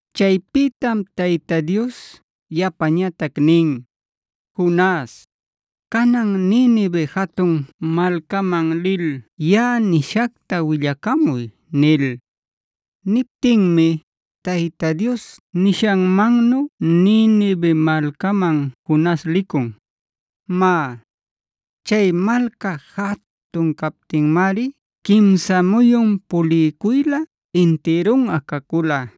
Chaypïtam Tayta Dios yapañatac nin: “Jonas, canan Ninive jatun malcaman lil yaꞌa nishacta willacamuy” nil. Niptinmi Tayta Dios nishanmannu Ninive malcaman Jonas licun. Má, chay malca jatun captinmari quimsa muyun puliycuylä intirunꞌa cacula.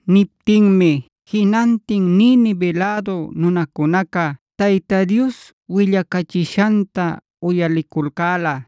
Niptinmi jinantin Ninive lädu nunacunaca Tayta Dios willacachishanta uyaliculcäla.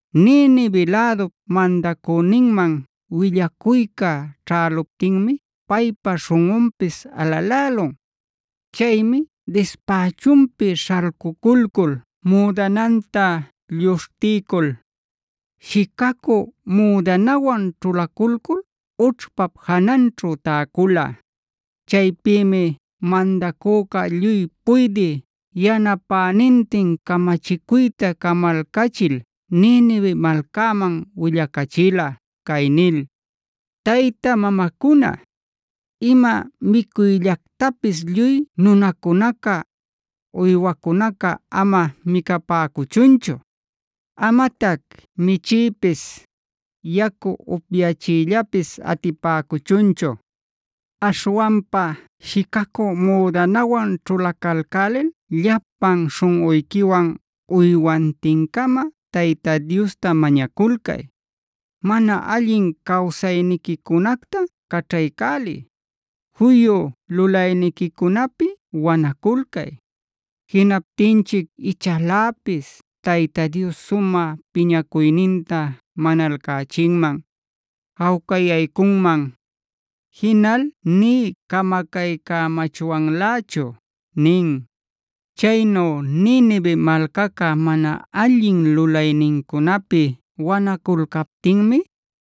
Ninive lädup mandacüninman willacuyca ćhäluptinmi paypa śhunꞌunpis alalälun. Chaymi dispächunpi śhalcuculcul, müdananta lluśhtiycul, shicacü müdanawan ćhulaculcul ućhpap jananćhu täcula. Chaypïmi mandacüca lluy puydï yanapänintin camachicuyta camalcachil Ninive malcäman willacachila cay nil: “Tayta mamacuna, ima micuyllactapis lluy nunacunaca, uywacunaca ama micapäcuchunchu. Amatac michiypis, yacu upyachiyllapis atipäcuchunchu. Aśhwanpa shicacü müdanawan ćhulacalcälil llapan śhunꞌuyquiwan uywantin-cama Tayta Diosta mañaculcay. Mana allin cawsayniquicunacta caćhaycäliy; juyu lulayniquicunapi wanaculcay. Jinaptinchic ichaläpis Tayta Dios sumä piñacuyninta manalcachinman, jawcayaycunman; jinal nï camacaycamachwanlächu” nin. Chaynu Ninive malcaca mana allin lulaynincunapi wanaculcaptinmi,